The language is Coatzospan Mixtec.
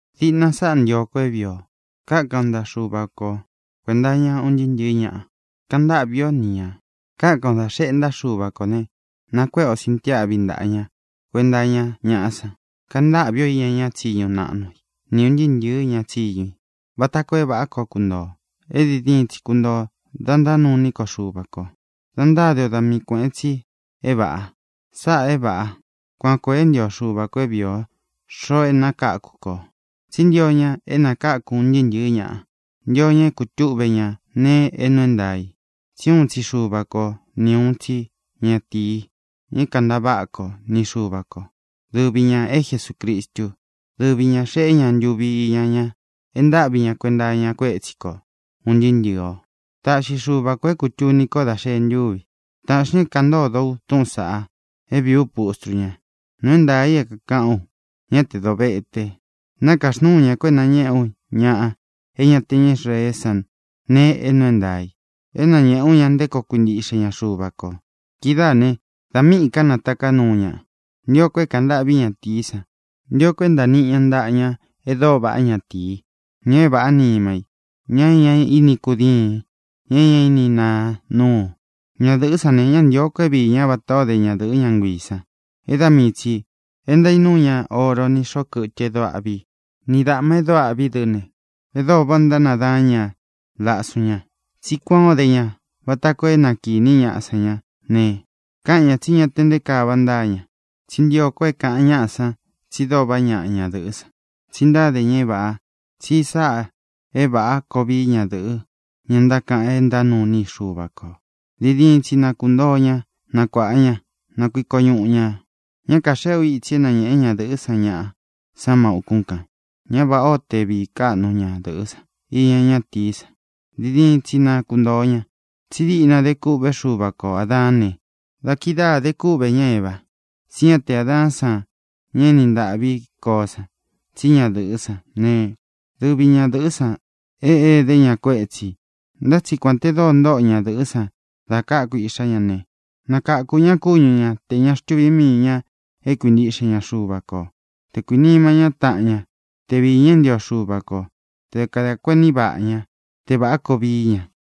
Diꞌna sáꞌā ntio ko é vīi o: Kákan o ntaꞌa Xuva ko kuēnta iña un ntɨɨ́ ntɨ̄ɨ́ ñaꞌa; kaꞌan ntáꞌvī ó ni ñā. Kákan o dā xeꞌe ntáꞌa Xuva kō ne, nakuéꞌe o sintiáꞌvi ntaꞌa ña kuenta iña ñaꞌá san. Kaꞌan ntâꞌvi o iña ña tsíñu naꞌnu i ni ūn ntɨɨ́ ntɨ̄ɨ́ ña tsiñu i vata koo é vāꞌá koo kuntoo ō, é diin diin tsi kuntoo ō, da ntánuu iní ko Xuva kō, dá ntáde o da mii kuēꞌen tsi é vāꞌa. Sáꞌā é vāꞌa. Kuan koo e ntío Xuva kō é vīi o, xoꞌo é nakākú kō. Tsí ntio ña é nākáku un ntɨɨ́ ntɨ̄ɨ́ ñaꞌa; ntio ña é kūtúꞌve ña nēe é nuu é ntaā i. Tsí uun tsi Xuva ko ni uun tsi ñatīi, ña é kāntaváꞌa ko ni Xuva ko, dɨvi ñā é Jesucristu. Dɨvi ñā xeꞌé ña ntuvi iña ña e ntáꞌvi ña kuenta iña kuétsi ko ūn ntɨɨ́ ntɨ̄ɨ o. Taꞌxi Xuva kō é kūtuni ko dá xēe ntúvi i. Tāꞌxi ña é kāꞌan ntódo ú túꞌūn saꞌa, é vīí u pustru ña. Nuu é ntaā i é kākaꞌán u, ñá tē dovete. Nākaxnúu ña ko é nañēꞌé u ña é ña te ña Israeé san nēe é nuu é ntaā i, é nañēꞌé u ña nté koo kuintiꞌxe ña Xuva kō. Kidáā ne, da míꞌī ká nataká nuu ñaꞌa, ntio ko é kāꞌan ntâꞌví ñatīí san; ntio ko é ntāa niꞌi ña ntaꞌa ña e dóo vaꞌá, ñatīí, ña é vāꞌá nima í, ña é ña ini kudíīn, ña é ña ini naa núu. Ñadɨ̄ꞌɨ́ san ne, ñá ntīo ko é viī ñá vatā ó de ñadɨ̄ꞌɨ́ ña nguiī san é da mii tsī e ntaínuú ña oro ni xōꞌo kɨtɨ e dóo aꞌví i ni dāꞌma e dóo aꞌví i dɨ́ ne, e dóo váꞌā ó ntánadaán ña lasun ña. Tsí kuān ó de ña vata koo é na kīní ñaꞌa san ñá ne, káꞌan ñā tsí ña te nté kaa vaꞌa ntáa ña. Tsí ntio ko é kāꞌan ñaꞌa san tsi dóo vaꞌá ñaꞌa ñadɨ̄ꞌɨ́ san, tsi ntáde ña é vāꞌa, tsi sáꞌā é vāꞌá koo vií ñadɨ̄ꞌɨ, ña ntákaꞌan é ntánuu iní i Xuva kō. Diin diin tsi na kuntoo ña nakuāꞌa ña; na kuiko ñuꞌu ñā. Ñá kāxeꞌé u itsi é nañēꞌe ñádɨ̄ꞌɨ́ san ñaꞌa san má ūkún kān. Ñá vāꞌá o te vīí kaꞌnu ñadɨ̄ꞌɨ́ san iña ñátīí san; diin diin tsi na kuntōo ña. Tsí diꞌna de kûꞌvé Xuva ko Ādaán ne, da kidáā de kúꞌvē ñá Eva. Tsí ña te Adaán san, ña e éni ntāꞌví koó san, tsí ñadɨ̄ꞌɨ́ san. Ne, dɨvi ñadɨ̄ꞌɨ́ san é edé ña kuétsī. Ntá tsi kuān te dóo ntoꞌo ñadɨ̄ꞌɨ́ san dá kāku iꞌxá ña ne, nakakū ña kúñu ña tē ña xtuví mii ñā é kuintiꞌxe ña Xuva kō; te kuīnima ñá taꞌan ña; te viī ña é ntio Xuva kō; te kadā kuení vaꞌa ñá; te vāꞌá koo vií ña.